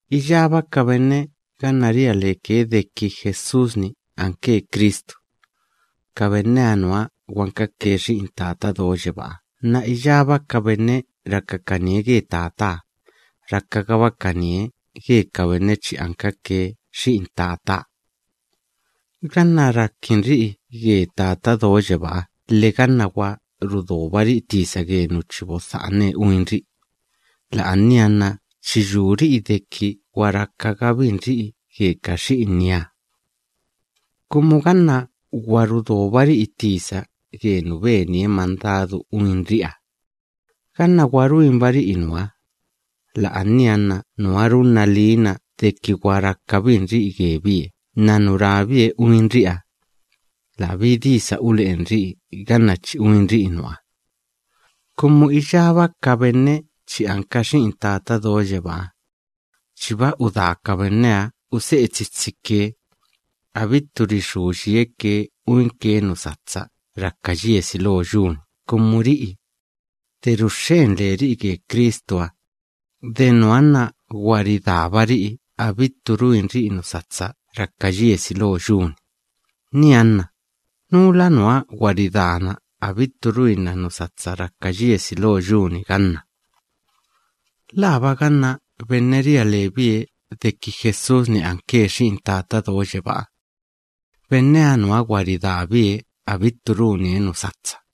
Iyába ka benne ganna ria leke deki Jesús‑ni anke Cristu, ka benneha nuha gwankake xi'in Tata Do Yebáha nna iyába ka benne rakakanie ge Tataha, rakagabakanie ge ka benne chi ankake xi'in Tataha. Ganna rakinri'i ge Tata Do Yebáha lhe ganna gwa rudobari'i tisa ge nu chi bodha'ane uinri'i, la'ania nna chi yuri'i deki gwa rakagabinri'i ge ka xi'inieha. Kumu ganna gwa rudobari'i tisa ge nu benie mandadu uinri'iha, ganna gwa ruinbari'i nuha, la'ania nna nuha runna liina deki gwa rakabinri'i gebie nna nu rabie uinri'iha, labí disa ule'enri'i ganna chi uinri'i nuha. Kumu iyába ka benne chi anka xi'in Tata Do Yebáha chiba udaa ka benneha use'e tsitsike, abittu rixú yieke uinke nu satsa raka yiesi lo yu‑ni. Kumu ri'i, de ruxxen leri'i ge Cristuha, de nuha nna gwa ridaabari'i abittu ruinri'i nu satsa raka yiesi lo yu‑ni. Nianna, ¿núla nuha gwa ridaana abittu ruinna nu satsa raka yiesi lo yu‑ni ganna? ¿Laaba ganna benne ria lebie deki Jesús‑ni anke Xi'in Tata Do Yebáha? Benneha nuha gwa ridaabie abittu runie nu satsa.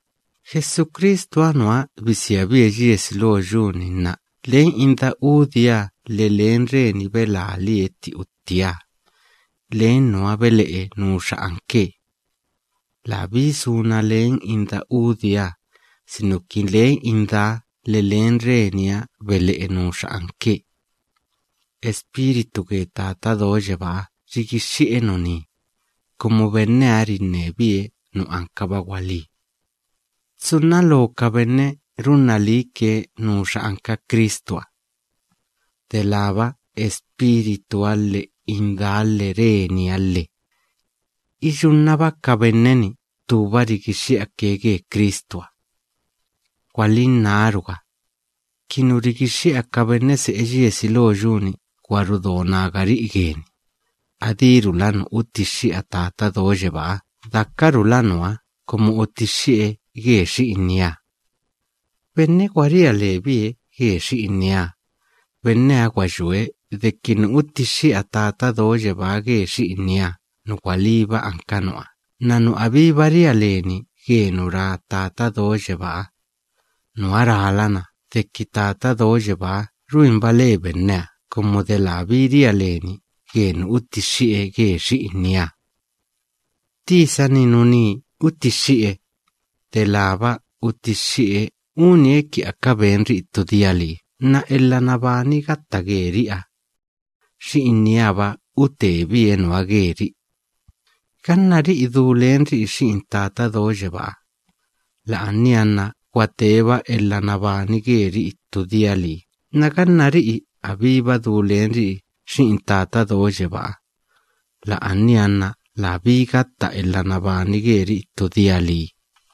Jesucristuha nuha bisiabie yiesi lo yu‑ni nna len inda udieha lhe len reni belalie tti uttieha, len nuha bele'e nuxa anke. Labí suna len inda udieha, sinuki len indaha lhe len reniha bele'e nuxa anke. Espíritu ge Tata Do Yebáha rigixxi'e nuní, kumu benneha rinnebie nu anka gwalí. Tsunna loo ka benne runna liike nuxa anka Cristuha, delába Espírituha lhe indaha lhe reniha lhe. Iyunnaba ka benne‑ni ttúba rigixxi'ake ge Cristuha. Gwalinnáruga, ki nu rigixxi'a ka benne se'e yiesi lo yu‑ni gwa rudo nagari'i geni, adírula nu utixxi'a Tata Do Yebáha dakarula nuha kumu utixxi'e ge Xi'inieha. Laxkala benne gwa ria lebie ge Xi'inieha, benneha gwa yue deki nu utixxi'a Tata Do Yebáha ge Xi'inieha nu gwalíba anka nuha nna nu abíba ria leni ge nu ra Tata Do Yebáha, nuha nna rálana deki Tata Do Yebáha ruinba le benneha kumu de labí ria leni ge nu utixxi'e ge Xi'inieha. Tisa‑ni nuní utixxi'e, delába utixxi'e unie ki aka benri'i ttu dia lii nna elha nabani gatta geri'iha, Xi'inieha‑ba utebie nuha geri'i. Ganna ri'i du lenri'i Xi'in Tata Do Yebáha, la'ania nna gwa teeba elha nabani geri'i ttu dia lii nna ganna ri'i abíba du lenri'i Xi'in Tata Do Yebáha, la'ania nna labí gatta elha nabani geri'i ttu dia lii.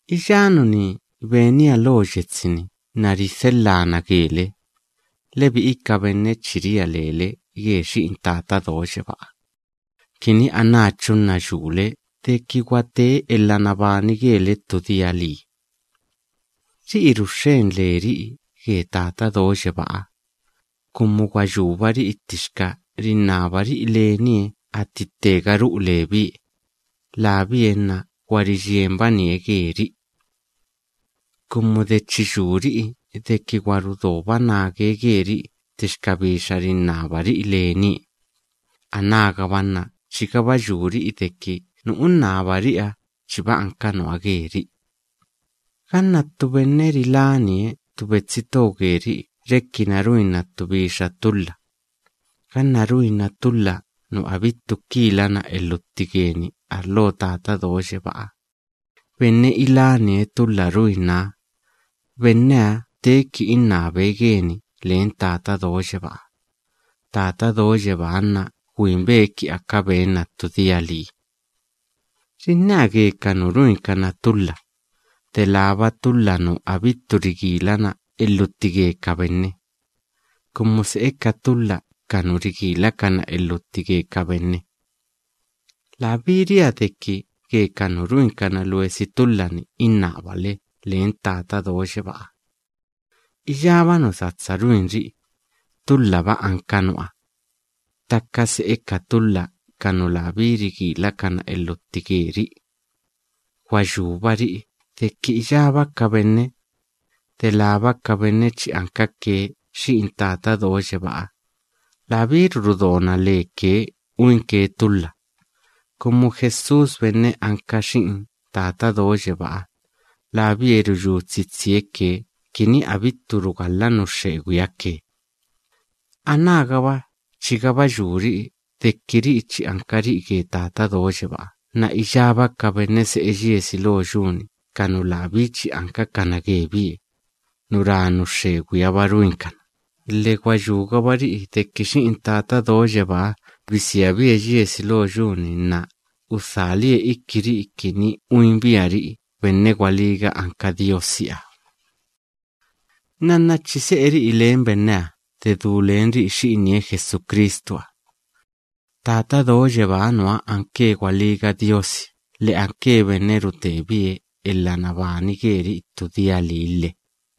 Iyá nuní benia lo yetsi‑ni nna ridhelhaa na gele, lebi'i ka benne chi ria lele ge Xi'in Tata Do Yebáha, kini anáchu nna yule deki gwa tee elha nabani gele ttu dia lii. Ri'i ruxxen leri'i ge Tata Do Yebáha, kumu gwa yúbari'i ttixka rinnabari'i lenie atti ttega ru'u lebie, labie nna gwa riyienbanie geri'i. Kumu de chi yuri'i deki gwa rudoba nage geri'i ttixka bixa rinnabari'i lenie, anágaba nna chigaba yuri'i deki nu unnabari'iha chiba anka nuha geri'i. Ganna ttu benne rilánie ttu betsi to geri'i rekina ruinna ttu bixa tulha, ganna ruinna tulha nu abittu kilana elhutti geni arlo Tata Do Yebáha, benne ilánie tulha ruinnaha, benneha teeki innabe geni len Tata Do Yebáha. Tata Do Yebáha nna gwinbe ki aka benna ttu dia lii. Rinnea ge ka nu ruinkana tulha, delába tulha nu abittu rigilana elhutti ge ka benne, kumu se'e ka tulha ka nu rigilakana elhutti ge ka benne. Labí ria deki ge ka nu ruinkana luesi tulha‑ni innabale len Tata Do Yebáha. Iyába nu satsa ruinri'i, tulhaba anka nuha, ttaka se'e ka tulha ka nu labí rigilakana elhutti geri'i. Gwa yúbari'i deki iyába ka benne, delába ka benne chi ankake xi'in Tata Do Yebáha, labíru rudona leke uinke tulha, kumu Jesús benne anka Xi'in Tata Do Yebáha, labie ruyú tsitsie ke kini abittu ridí yie nu xxegwiha ke. Anágaba chigaba yuri'i deki ri'i chi ankari'i ge Tata Do Yebáha nna iyába ka benne se'e yiesi lo yu‑ni ka nu labí chi ankakana gebie, nu ra nu xxegwiha‑ba ruinkana, lhe gwa yúgabari'i deki Xi'in Tata Do Yebáha bisiabie yiesi lo yu‑ni nna udhalie ikiri'i kini uinbiari'i benne gwalíga anka Diosiha. Nnanna chi se'eri'i len benneha de du lenri'i Xi'inie Jesucristuha. Tata Do Yebáha nuha anke gwalíga Diosi lhe anke benne rutebie elha nabani geri'i ttu dia lii lhe.